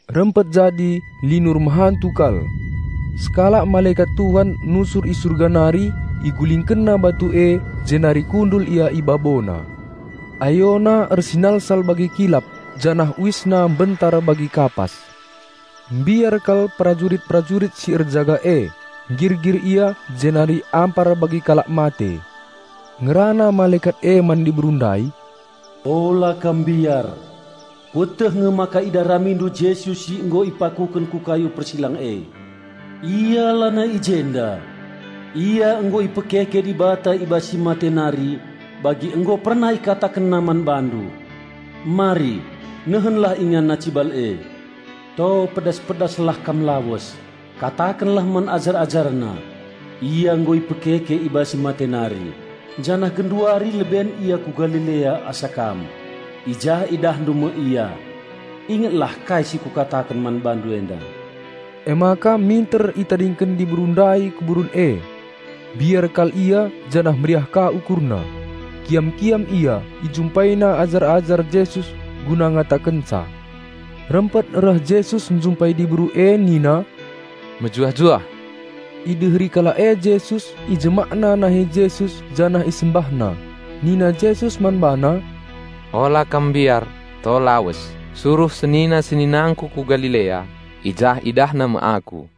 Rempet jadi linur mehantu kal. Sekalak malekat Tuhan nusur i Surga nari, igulingkenna batu e jenari kundul ia i babona. Ayona ersinalsal bagi kilap janah uisna mbentar bagi kapas. Mbiar kal perajurit-perajurit si erjaga e, nggirgir ia jenari ampar bagi kalak mate. Ngerana malekat e man diberu ndai, "Ola kam mbiar! Kueteh nge maka idaramindu Jesus si nggo ipakuken ku kayu persilang e. Ia lanai i jenda. Ia nggo ipekeke Dibata i bas si mate nari bagi nggo pernah IkatakenNa man bandu. Mari, nehenlah InganNa cibal e. To pedas-pedaslah kam lawes, katakenlah man ajar-AjarNa, 'Ia nggo ipekeke i bas si mate nari, janah genduari leben Ia ku Galilea asa kam. I jah idahndu me Ia.' Ingetlah kai si kukataken man bandu enda." Emaka minter itadingken diberu ndai kuburen e. Mbiar kal ia janah meriah ka ukurna. Kiam-kiam ia, ijumpaina ajar-ajar Jesus guna ngatakenca. Rempet reh Jesus njumpai diberu e nina, "Mejuah-juah!" Ideheri kalak e Jesus, ijemakna nahe Jesus janah isembahna. Nina Jesus man bana, "Ola kam mbiar to lawes, suruh senina-seninangKu ku Galilea. I jah idahna me Aku."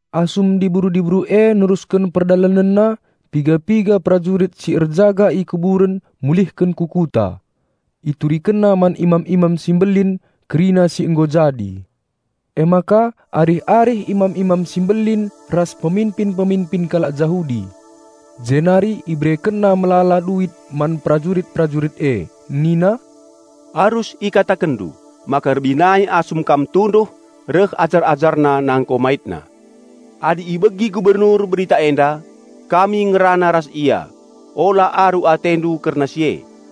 Asum diberu-diberu e nerusken perdalanenna, piga-piga perajurit si erjaga i kuburen mulihken ku kuta. Iturikenna man imam-imam si mbelin kerina si nggo jadi. Emaka arih-arih imam-imam si mbelin ras peminpin-peminpin kalak Jahudi. Jenari iberekenna melala duit man perajurit-perajurit e, nina, "Arus ikatakenndu maka rebinai asum kam tunduh reh ajar-AjarNa nangko MaitNa. Adi ibegi Gubernur berita enda, kami ngerana ras ia, ola aru atendu kerna si e."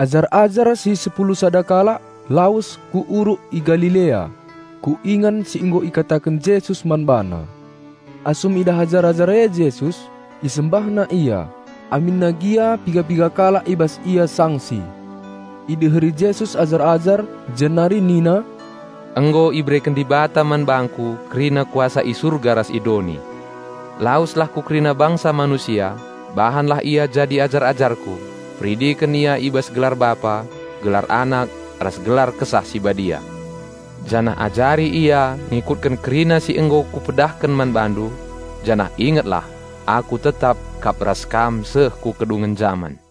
Ajar-ajar si sepulu sada kalak lawes ku uruk i Galilea, ku ingan si nggo ikataken Jesus man bana. Asum idah ajar-ajar e Jesus, isembahna Ia, aminna gia piga-piga kalak i bas ia sangsi. Ideheri Jesus ajar-ajar, jenari nina, "Nggo ibereken Dibata man bangKu kerina kuasa i surga ras i doni. Laweslah ku kerina bangsa manusia, bahanlah ia jadi ajar-ajarKu: Peridiken ia i bas gelar Bapa, gelar Anak, ras gelar Kesah Si Badia, janah ajari ia ngikutken kerina si nggo Kupedahken man bandu. Janah ingetlah! Aku tetap kap ras kam seh ku kedungen jaman."